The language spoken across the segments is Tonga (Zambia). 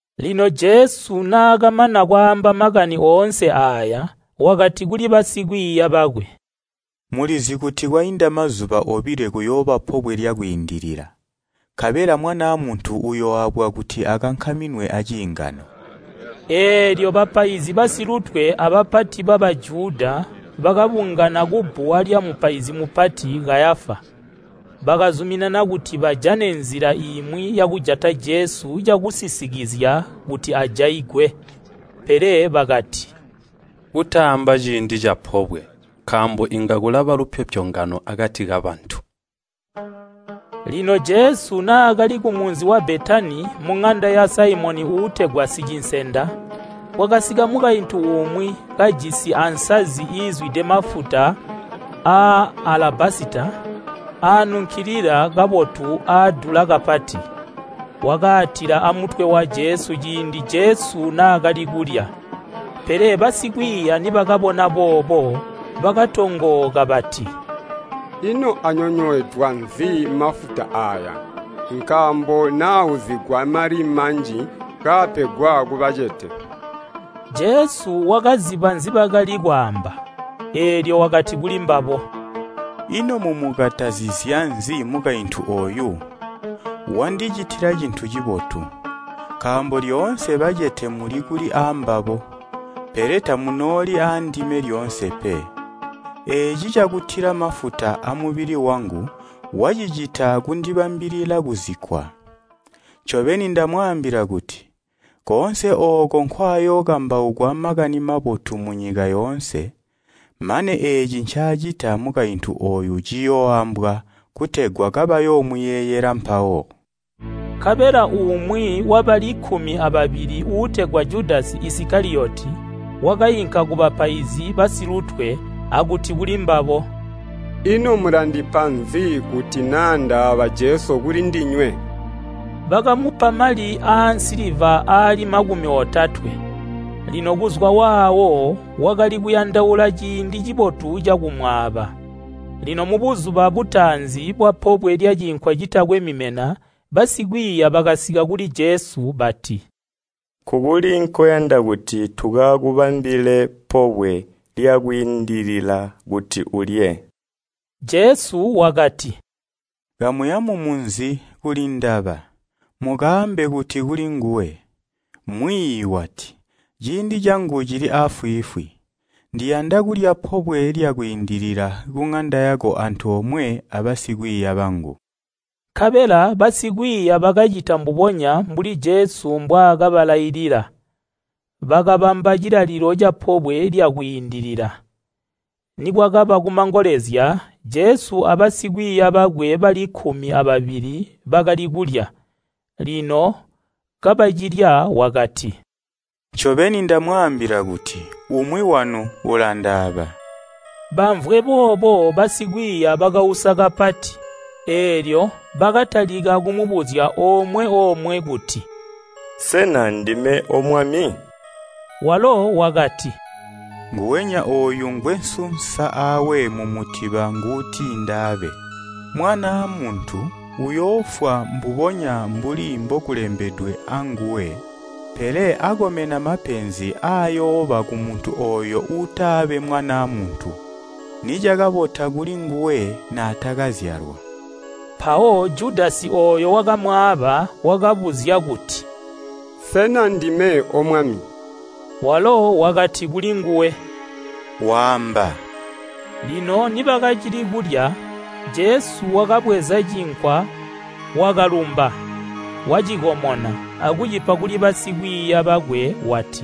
Lino Jesu naakamana kwaamba makani oonse aaya, wakati kuli basikwiiya bakwe, “Mulizi kuti kwainda mazuba obilo kuyooba Pobwe lya Kwiindilila, nkabela Mwanaa Muntu uyooabwa kuti akankaminwe aciingano.” Eelyo bapaizi basilutwe abapati ba Bajuda bakabungana kubbuwa lyamupaizi mupati, Kayafa. Bakazuminana kuti bajane nzila imwi yakujata Jesu cakusisikizya kuti ajaigwe. Pele bakati, “Kutaamba ciindi capobwe, nkaambo inga kulaba lupyopyongano akati kabantu.” Lino Jesu naakali kumunzi wa Betani muŋanda ya Saimoni uutegwa sicinsenda. Kwakasika mukaintu umwi kajisi ansazi iizwide mafuta aanunkilila kabotu aadula kapati. Wakaatila amutwe wa Jesu ciindi Jesu naakali kulya. Pele basikwiiya nibakabona boobo, bakatongooka bati, “Ino anyonyweedwa nzi mafuta aaya? Nkaambo naauzigwa mali manji kaapegwa kubacete.” Jesu wakaziba nzibakali kwaamba, eelyo wakati kulimbabo, “Ino mumukatazizya nzi mukaintu ooyu? Wandicitila cintu cibotu. Nkaambo lyoonse bacete muli kuli aambabo, pele tamunooli aandime lyoonse pe. Eeci cakutila mafuta amubili wangu wacicita kundibambilila kuzikkwa. Ncobeni ndamwaambila kuti, koonse ooko nkwaayookambaukwa Makani Mabotu munyika yoonse, mane eeci ncaacita mukaintu ooyu ciyooambwa, kutegwa kabayoomuyeeyela mpawo.” Nkabela umwi wabali kkumi ababili uutegwa Judasi Isikaliyoti wakainka kubapaizi basilutwe akuti kulimbabo, “Ino mulandipa nzi kuti naa ndaaba Jesu kulindinywe?” Bakamupa mali aansiliva aali makumi otatwe. Lino kuzwa waawo wakali kuyandaula ciindi cibotu cakumwaaba. Lino mubuzuba butaanzi bwapobwe lya Cinkwa Citakwe Mimena basikwiiya bakasika kuli Jesu bati, “Nkukuli nkoyanda kuti tukakubambile Pobwe lya Kwiindilila kuti ulye?” Jesu wakati, “Kamuya mumunzi kulindaba, mukaambe kuti kulinguwe, Mwiiyi wati, ‘Ciindi cangu cili aafwiifwi. Ndiyanda kulya pobwe kuŋanda yako antoomwe abasikwiiya bangu.’” Nkabela basikwiiya bakacita mbubonya mbuli Jesu mbwaakabalailila. Bakabamba cilalilo ca Pobwe lya Kwiindilila. Nikwakaba kumangolezya Jesu abasikwiiya bakwe bali kkumi ababili bakali kulya. Lino kabacilya wakati, “Ncobeni ndamwaambila kuti, umwi wanu ulandaaba.” Bamvwe boobo basikwiiya bakausa kapati, eelyo bakatalika kumubuzya omwe omwe kuti, “Sena ndime O Mwami?” Walo wakati, “Nguwenya ooyu ngwesunsa aawe mumutiba nguuti ndaabe. Mwanaa Muntu uyoofwa mbubonya mbuli mbokulembedwe anguwe. Pele akomena mapenzi ayooba kumuntu ooyo uutaabe Mwanaa Muntu! Nicakabota kuli nguwe naatakazyalwa.” Mpawo Judasi ooyo wakamwaaba wakabuzya kuti, “Sena ndime O Mwami?” Walo wakati kulinguwe, “Waamba.” Lino nibakacili kulya, Jesu wakabweza cinkwa wakalumba, wacikomona, akucipa kuli basikwiiya bakwe wati,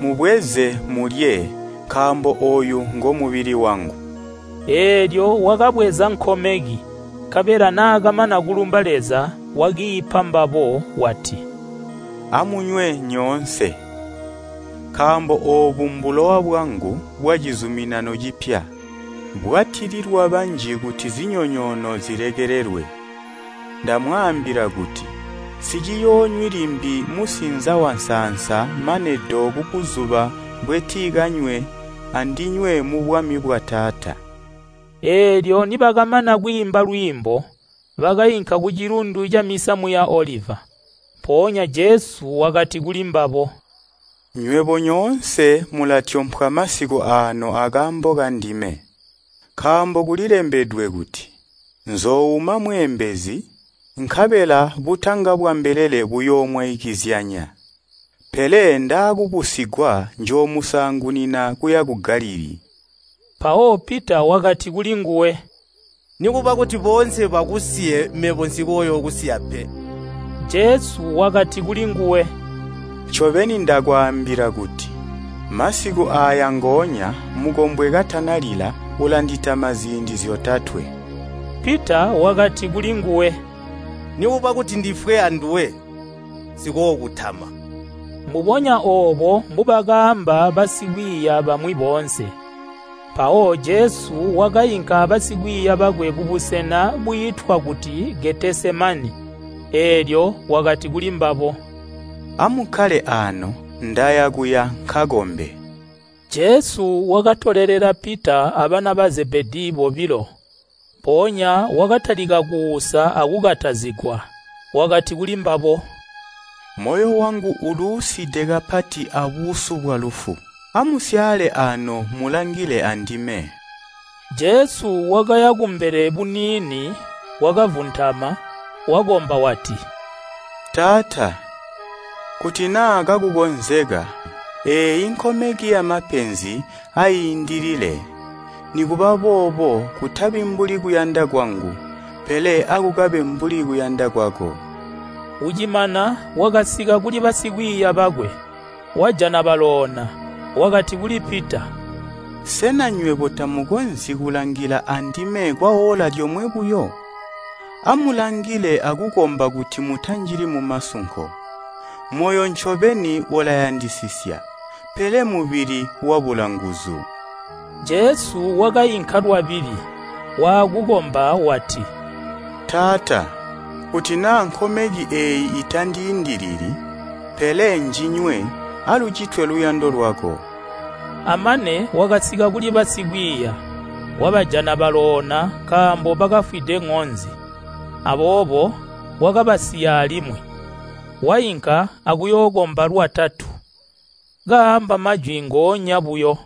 “Mubweze, mulye, nkaambo ooyu ngomubili wangu.” Eelyo wakabweza nkomeki, nkabela naakamana kulumba Leza wakiipa mbabo, wati, “Amunywe nyoonse. Nkaambo oobu mbulowa bwangu bwacizuminano cipya, bwatililwa banji kuti zinyonyoono zilekelelwe. Ndamwaambila kuti, nsiciyoonywi limbi musinza wansaansa mane do kubuzuba mbwentikanywe andinywe mubwami bwa Taata.” Eelyo nibakamana kwiimba lwiimbo, bakainka ku Cilundu camisamu ya Oliva. Mpoonya Jesu wakati kulimbabo, “Nywebo nyoonse mulatyompwa masiku aano akaambo kandime, nkaambo kulilembedwe kuti, ‘Nzoouma mweembezi, nkabela butanga bwa mbelele buyoomwaikizyanya.’ Pele ndaakubusigwa njoomusaangunina kuya ku Galilii.” Mpawo Pita wakati kulinguwe, “Nikuba kuti boonse bakusiye mebo nsikookusiya pe.” Jesu wakati kulinguwe, “Ncobeni ndakwaambila kuti, masiku aaya ngoonya, mukombwe katanalila, ulanditama ziindi zyotatwe.” Pita wakati kulinguwe, “Nikuba kuti ndifwe anduwe, nsikookutama.” Mbubonya oobo mbubakaamba basikwiiya bamwi boonse. Mpawo Jesu wakainka abasikwiiya bakwe kubusena bwiitwa kuti Getesemani, eelyo wakati kuli mbabo, “Amukkale aano, ndaya kuya nkakombe.” Jesu wakatolelela Pita abana ba Zebedii bobilo. Mpoonya wakatalika kuusa akukatazigwa. Wakati kulimbabo, “Moyo wangu uluuside kapati abuusu bwalufu. Amusyaale aano mulangile andime.” Jesu wakaya kumbele buniini wakavuntama, wakomba wati, “Taata, kuti naa kakukonzeka, eeyi nkomeki yamapenzi aiindilile. Nikuba bobo, kutabi mbuli kuyanda kwangu, pele akukabe mbuli kuyanda kwako.” Ucimana wakasika kuli basikwiiya bakwe, wajana baloona. Wakati kuli Pita, “Sena nywebo tamukonzyi kulangila andime kwaoola lyomwe buyo? Amulangile akukomba kuti mutanjili mumasunko. Moyo ncobeni ulayandisisya, pele mubili wabula nguzu.” Jesu wakainka lwabili, waakukomba wati, “Taata, kuti naa nkomeki eeyi itandiindilili, pele njinywe alucitwe luyando lwako.” Amane wakasika kuli basikwiiya, wabajana baloona nkaambo bakafwide ŋonzi. Aboobo wakabasiya alimwi, wainka akuyookomba lwatatu, kaamba majwi ngoonya buyo.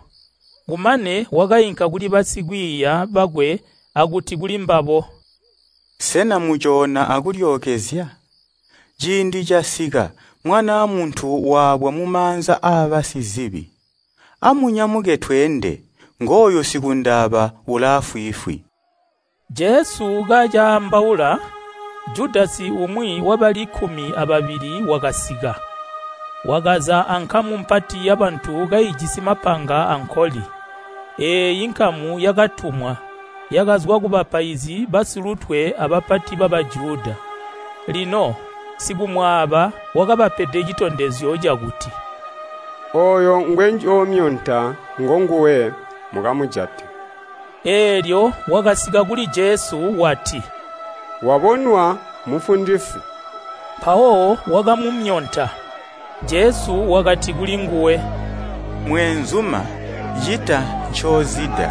Kumane wakainka kuli basikwiiya bakwe akuti kulimbabo, “Sena mucoona akulyookezya? Ciindi casika, Mwanaa Muntu waabwa mumaanza aabasizibi. Amunyamuke tweende. Ngooyu sikundaaba ulaafwiifwi.” Jesu kacaambaula, Judasi umwi wabali kkumi ababili wakasika. Wakaza ankamu mpati yabantu kaijisi mapanga ankoli. Eeyi nkamu yakatumwa, yakazwa kubapaizi basilutwe abapati ba Bajuda. Lino sikumwaaba wakabapede citondezyo cakuti, “Ooyo ngwenjoomyonta ngonguwe, mukamujate.” Eelyo wakasika kuli Jesu wati, “Wabonwa, Mufundisi!” Mpawo wakamumyonta. Jesu wakati kulinguwe, “Mweenzuma, cita ncoozida.”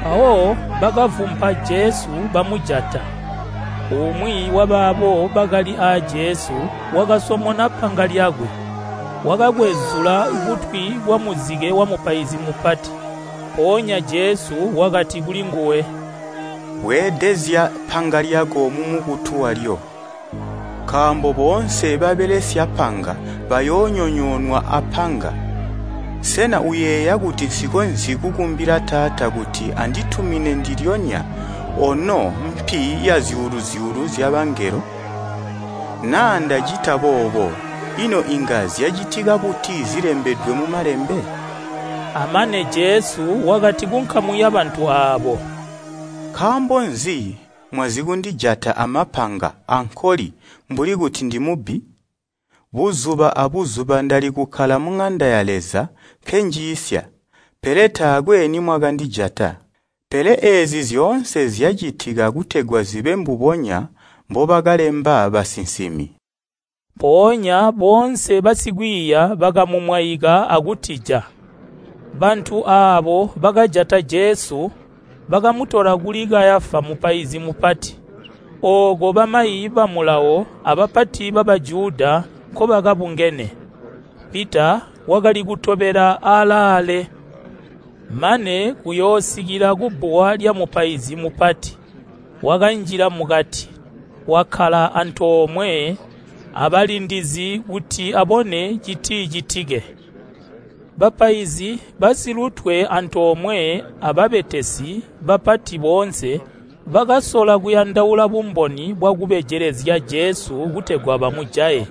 Mpawo bakavumpa Jesu bamujata. Umwi wabaabo bakali aa Jesu wakasomona panga lyakwe, wakakwezula kutwi kwa muzike wamupaizi mupati. Mpoonya Jesu wakati kulinguwe, “Bweedezya panga lyako mumukutu walyo, nkaambo boonse babelesya panga bayoonyonyoonwa apanga. Sena uyeeya kuti nsikonzyi kukumbila Taata kuti anditumine ndilyonya ono zyuulu-zyuulu zyabangelo? Naa ndacita boobo, ino inga zyacitika buti zilembedwe mu Malembe?” Amane Jesu wakati kunkamu yabantu aabo, “Nkaambo nzi mwazikundijata amapanga ankoli mbuli kuti ndimubbi? Buzuba abuzuba ndali kukkala muŋanda ya Leza nkenjiisya, pele taakwe nimwakandijata. Pele eezi zyoonse zyacitika kutegwa zibe mbubonya mbobakalemba basinsimi.” Mpoonya boonse basikwiiya bakamumwaika akutija. Bantu aabo bakajata Jesu bakamutola kuli Kayafa mupaizi mupati, ooko bamayi ba Mulawo abapati ba Bajuda nkobakabungene. Pita wakali kutobela aalaale mane kuyoosikila kubbuwa lyamupaizi mupati. Wakanjila mukati, wakkala antoomwe abalindizi kuti abone citicitike. Bapaizi basilutwe antoomwe ababetesi bapati boonse bakasola kuyandaula bumboni bwakubejelezya Jesu kutegwa bamujaye.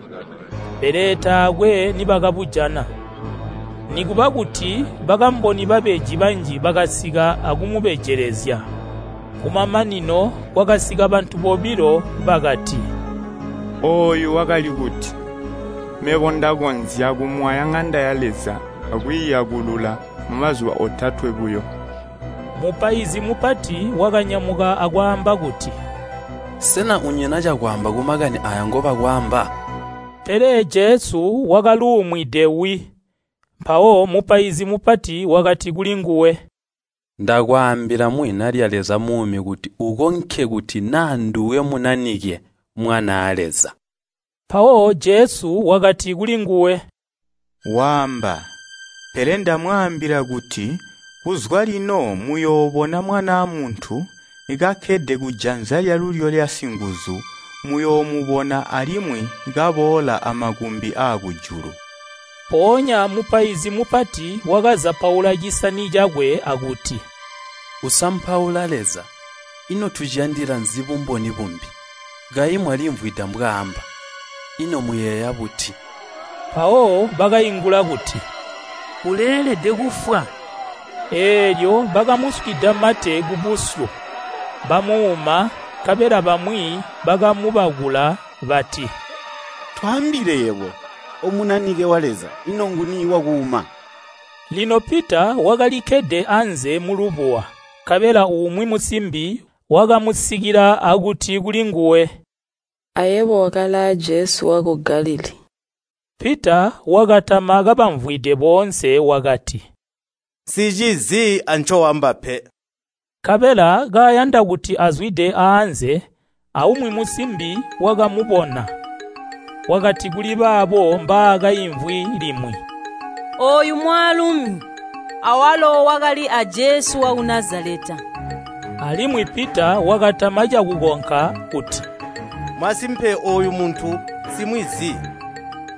Pele taakwe nibakabujana, nikuba kuti bakamboni babeji banji bakasika akumubejelezya. Kumamanino kwakasika bantu bobilo bakati, “Ooyu wakali kuti, ‘Mebo ndakonzya kumwaya ŋanda ya Leza akwiiyakulula mumazuba otatwe buyo.’” Mupaizi mupati wakanyamuka akwaamba kuti, “Sena unyina cakwaamba kumakani aaya ngobakwaamba?” Pele Jesu wakaluumwide wi. Mpawo mupaizi mupati wakati kulinguwe, “Ndakwaambila muzina lya Leza muumi kuti ukonke kuti naa nduwe Munanike, Mwanaa Leza?” Mpawo Jesu wakati kulinguwe, “Waamba. Pele ndamwaambila kuti kuzwa lino muyoobona Mwanaa Muntu kakkede kujanza lyalulyo lya Singuzu muyoomubona alimwi kaboola amakumbi aakujulu.” Mpoonya mupaizi mupati wakazapaula cisani cakwe akuti, “Usampaula Leza, ino tuciyandila nzi bumboni bumbi? Kayi mwalimvwida mbwaaamba? Ino muyeeya buti?” Mpawo bakaingula kuti, “Uleelede kufwa.” Eelyo bakamuswida mate kubusyu, bamuuma nkabela bamwi bakamubakula bati, “Twaambile yebo O Munanike wa Leza. Ino nguni wakuuma?” Lino Pita wakalikkede anze mulubuwa. Nkabela umwi musimbi wakamusikila akuti kulinguwe, “Ayebo wakali aa Jesu waku Galilii.” Pita wakatama kabamvwide boonse wakati, “Nsicizi ancoamba pe.” Nkabela kayanda kuti azwide aanze, aumwi musimbi wakamubona, wakati kuli baabo mbaakaimvwi limwi, “Ooyu mwaalumi awalo wakali aa Jesu waku Nazaleta.” Alimwi Pita wakatama cakukonka kuti, “Masimpe ooyu muntu nsimwizi.”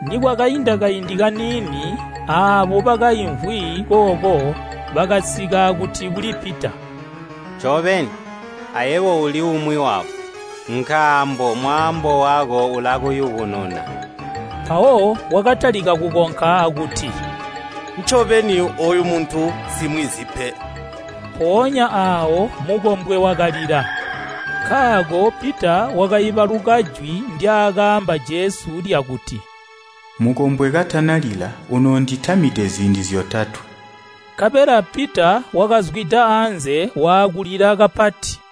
Nikwakainda kaindi kaniini aabo bakaimvwi kooko bakasika akuti kuli Pita, “Ncobeni, ayebo uli umwi wabo, nkaambo mwaambo wako ulakuyubununa.” Mpawo wakatalika kukonka akuti, “Ncobeni ooyu muntu nsimwizi pe.” Mponya aawo mukombwe wakalila. Nkaako Pita wakaibaluka jwi ndyaakaamba Jesu lyakuti, “Mukombwe katanalila unoonditamide ziindi zyotatwe.” Nkabela Pita wakazwida anze waakulila kapati.